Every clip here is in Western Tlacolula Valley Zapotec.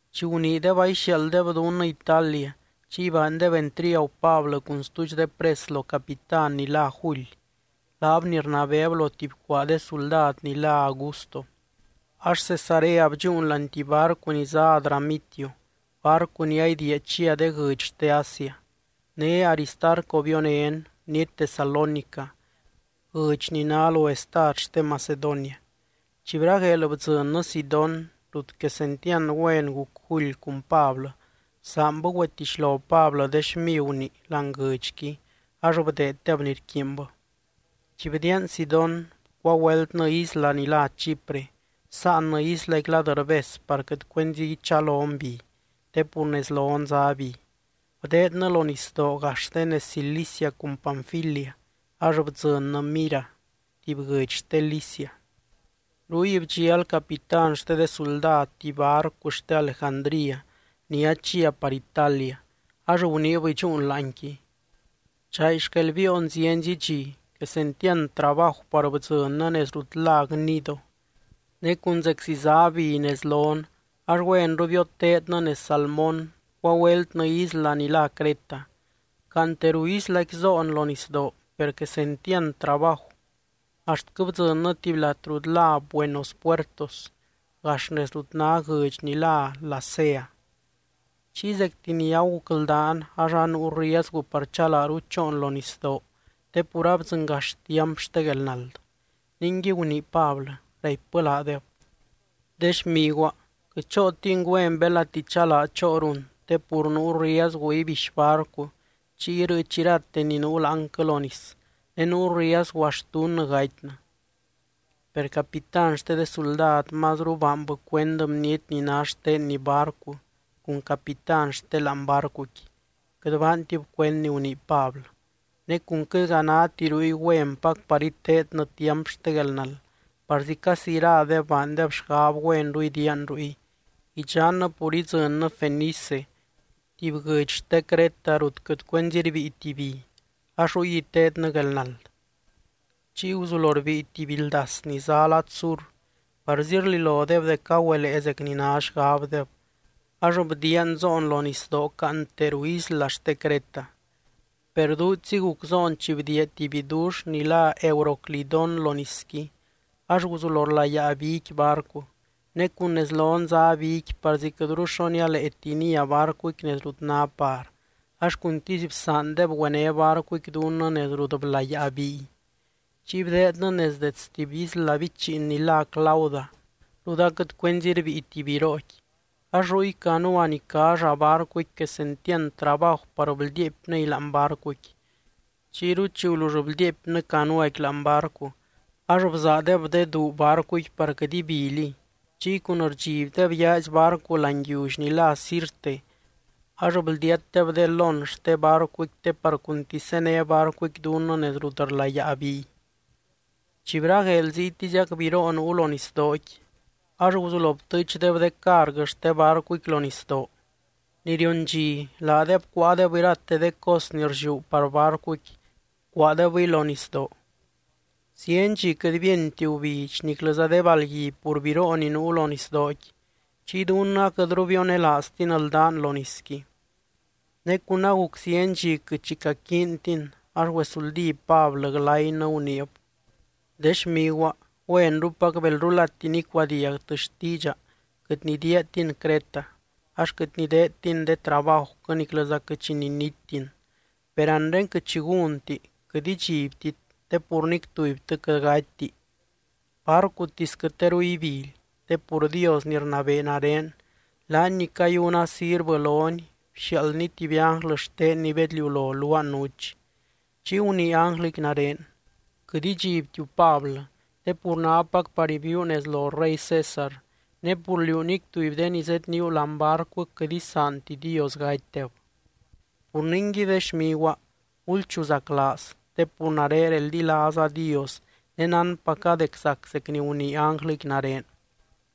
Chi guniideb aixiaalddeb dunnɨ Italia, chiy baandeb entriagu Pablɨ cun stuudx de pres lo capitán ni lá July, laab ni rnabeeb lo tuby cuaa de suldad ni lá Augusto. Ax Cesarea bdxúun láani tuby barcu ni zá Adramitio, barcu ni aidiia chia de guɨdx xte Asia. Né Aristarco bionén, bniety Tesalónica, guɨdx ni ná lo estad xte Macedonia. Chi bragueel bdzɨnnɨ Sidón, rut quesentiand güen guc July cun Pablɨ, bsaanbɨ güetixlo Pablɨ de xmiguni láani guɨdxqui ax bdeeddeb ni rquiinbɨ. Chi bdiian Sidón bcuagüeltnɨ isla ni lá Chipre, bsáannɨ islaqui lad rbes par quɨt cuenzi ichalon bi, te pur nez lon zá bi. Bdeednɨ lo nisdoo gax de nez Cilicia cun Panfilia ax bdzɨnnɨ Mira, tuby guɨdx xte Licia. Ruy bdxial capitán xte de suldad tuby barcu xte Alejandría ni chia par Italia, ax guniib idxúun láanqui. Chay xquel biion zienzi dxi, quesentiand trabaju par bdzɨnnɨ nez rut lá Gnido. Ne cun zeczi zá bi nez lon, ax güenru bioteednɨ nez Salmón, bcuagüeltnɨ isla ni lá Creta. Caante ruu islaqui zoon lo nisdoo, per quesentiand trabaju, axtquɨ bdzɨnnɨ tuby lat rut lá Buenos Puertos, gax nez rut ná guɨdx ni lá Lasea. Chiy zecti ni agucldaan, ax anuu riezgu par chalaaru choon lo nisdoo, te pur abdzɨngax tiamp xte guelnald. Ningui gunii Pablɨ, raipbɨ laadeb: —De xmiguaa, quɨt chootin güen belati chalaa choorun, te pur nuu riezgu ibixy barcu chiy irɨɨch irate ni nuu láanquɨ lo nis, ne nuu riezgu axt dunnɨ gatynɨ. Per capitán xte de suldad mazru baanbɨ cuend bniety ni ná xtenni barcu cun capitán xte láani barcuqui, quɨt baantib cuend ni gunii Pablɨ. Ne cun quɨtga náti ruy güenpac par iteednɨ tiamp xte guelnald, parzi casi iradeb baandeb xgab güenru idiian ruy, idxannɨ pur idzɨnnɨ Fenice, tuby guɨdx xte Creta rut quɨt cuenzi rbíiti bi, ax ruy iteednɨ guelnald. Chiy guzulo rbíi tuby bi ldas ni zá lad sur, parzi rlilodeb dec agüelee zec ni ná xgabdeb, ax bdiian zoon lo nisdoo caante ruu isla xte Creta. Per duudxzi guc zoon chi bdiia tuby bidux ni lá Euroclidón lo nisqui, ax guzulo rlayaa biqui barcu. Ne cun nez lon zá biqui parzi quɨtru xo nialaati nia barcuqui nez rut ná par, ax cuntisy bsaandeb güené barcuqui dunnɨ nez rut blayaa biy. Chiy bdeednɨ nez dets tuby isla bichiin ni lá Clauda, rut aquɨt cuenzi rbíiti birooqui, ax ruy canua ni cá llaa barcuqui quesentiand trabaju par bldiiepnɨy láani barcuqui. Chiyru chi gulull bldiiepnɨ canuaqui láani barcu, ax bzaadeb de duu barcuqui par quɨt ibiliy. Chiy cun rdxibdeb yaazy barcu láani yiully ni lá Sirte, ax bldiatdeb de lón xte barcuqui te par cuntisy zéne barcuqui dunnɨ nez rut rlayaa biy. Chi bragueel ziytiziac biroo nuu lo nisdooqui, ax guzulo btɨɨchdeb de carguɨ xte barcuqui lo nisdoo. Ni rion dxi, laadeb cuáadeb irate de cos ni rlliú par barcuqui bcuaadebɨy lo nisdoo. Zieny dxi quɨt bíenti gubidx niclɨza de balgui pur biroo ni nuu lo nisdooqui, chiy dunnɨ aquɨtru bionelaaztin ldán lo nisqui. Ne cun aguc zieny dxi quɨt xi caquiintin, ax güesuldí Pablɨ glaynɨ, guniib: —De xmiguaa, güenrupac belrulati nicuadiagtɨ xtiidxa quɨt nidiiatin Creta, ax quɨt nideedtin de trabajuquɨ niclɨza quɨt xi ninittin. Per anre quɨt xi gúnti, quɨt idxibtit, te pur nic tubytɨ quɨt gatyti, barcutisquɨ teru ibily. Te pur Dios ni rnabee nare, laany ni cayuna sirvɨ lony bxiaaldny tuby ánglɨ xtenny bedliulo luaa nuch, chiy gunii ánglɨqui nare: “Quɨt idxibtiu, Pablɨ, te pur nápac par ibiiu nez lo rey César, ne pur liú nic tuby de ni zedníu láani barcuquɨ quɨt isaanti Dios gatydeb.” Pur ningui, de xmiguaa, gulchuzaclaaz, te pur nare reldilaaza Dios ne nánpaca dec zac zec ni gunii ánglɨqui nare.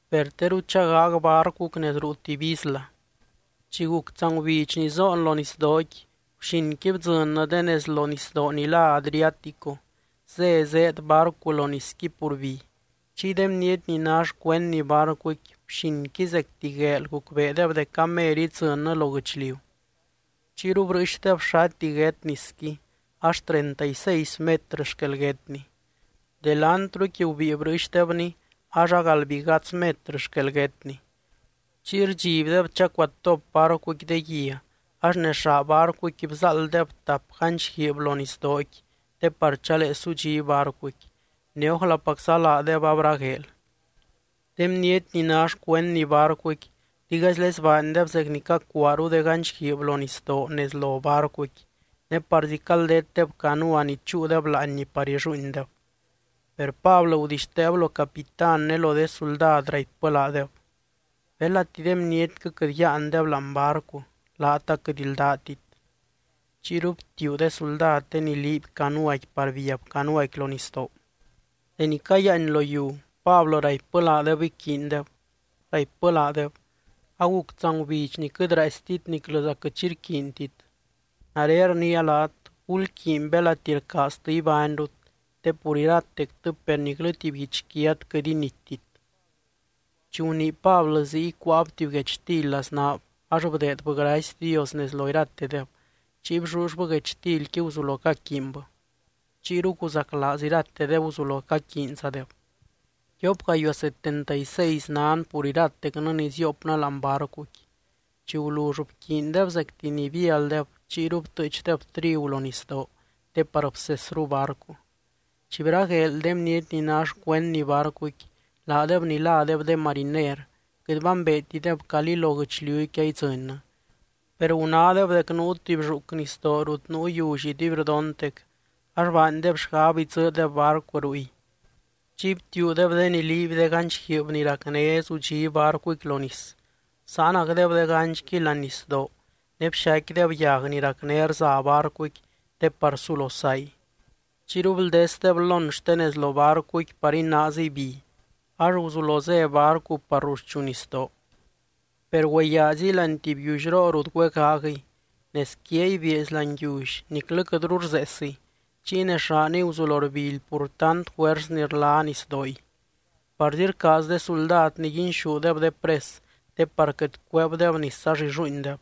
Per teru chagaag barcuquɨ nez ruu tuby isla. Chi guc tsangubidx ni zoon lo nisdooqui, guxinqui bdzɨnnɨ de nez lo nisdoo ni lá Adriático, zé zéed barcu lo nisqui pur bi. Chiy de bniety ni ná xcuendni barcuqui, guxinqui zecti gueel gucbeedeb dec amer idzɨnnɨ lo guɨchliu. Chiyru brɨɨxdeb xati guét nisqui, ax treinta y seis metrɨ xquel guétni. Delantruqui gubíi brɨɨxdebni ax agaldbigadz metrɨ xquel guétni. Chiy rdxibdeb chacuatop barcuqui de guia, ax nez llaa barcuqui bzaalddeb tap ganch guiib lo nisdooqui te par chalee sudxí barcuqui, ne ójlapacza laadeb abragueel. De bniety ni ná xcuendni barcuqui, digaizlezy baandeb zec ni cacuaaru de ganch guiib lo nisdoo nez lo barcuqui ne parzi caldetdeb canua ni chúudeb láanni par illuuindeb. Per Pablɨ gudixteeb lo capitán ne lo de suldad raipbɨ laadeb: —Belati de bnietquɨ quɨt yáandeb láani barcu, laat aquɨt ldátit. Chiyru btiuu de suldad de ni liiby canuaqui par biab canuaqui lo nisdoo. Deni cayiáany lo yiu, Pablɨ raipbɨ laadeb iquiindeb. Raipbɨ laadeb: —Aguc tsangubidx ni quɨt raaistit niclɨza quɨt xi rquiintit. Nare rniia laat, gulquiiny belati rcaaztɨ ibányrut, te pur iratectɨ per niclɨ tuby guichquiat quɨt inittit. Chi gunii Pablɨ ziy, cuáab tuby guechtily laznaab, ax bdeedbɨ gracy Dios nez lo iratedeb, chiy bllullbɨ guechtilqui guzulo caquiinbɨ. Chiyru guzaclaaz iratedeb guzulo caquiinzadeb. Tiop gayuaa setenta y seis nan pur iratecnɨ ni ziopnɨ láani barcuqui. Chi gulull bquiindeb zecti ni bialdeb, chiyru btɨɨchdeb trigu lo nisdoo te par bsesru barcu. Chi bragueel, de bniety ni ná xcuendni barcuqui, laadeb ni ládeb de mariner quɨt bambeetideb calí lo guɨchliuqui aidzɨnnɨ. Per gunádeb dec nuu tuby lluuc nisdoo rut nuu yiully iduibrdontec, ax baandeb xgab idzɨɨdeb barcu ruy. Chiy btiuudeb de ni liiby de ganch guiib ni racné zudxí barcuqui lo nis, bsáanacdeb de ganchqui láani nisdoo ne bxaicquideb yag ni racné rza barcuqui te par sulo say. Chiyru bldesdeb lón xte nez lo barcuqui par inaaziy bi, ax guzulo zé barcu par ruxchu nisdoo. Per güeyaaziy láani tuby yiullyroo rut güegaagɨy. Nez quiay bieezy láani yiully niclɨ quɨtru rzeesiy, chiy nez llaaniy guzulo rbily pur tant juers ni rla nisdooy. Parzi rcaaz de suldad niguinxúdeb de pres, te par quɨt cueebdeb nis ax illuuindeb.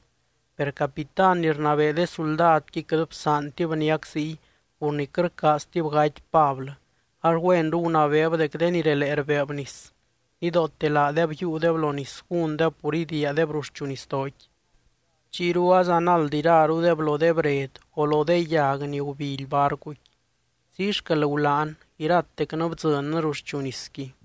Per capitán ni rnabee de suldadqui quɨt bsaantib niac ziy pur ni quɨt rcaaztib gaty Pablɨ, ax güenru gunabeeb dec de ni relee rbeeb nis, nidoote laadeb yiiudeb lo nis gúndeb pur idiiadeb ruxchu nisdooqui. Chiyru azanald irarudeb lo de bred o lo de yag ni gubily barcuqui. Ziy xquel gulán, iratecnɨ bdzɨnnɨ ruxchu nisqui.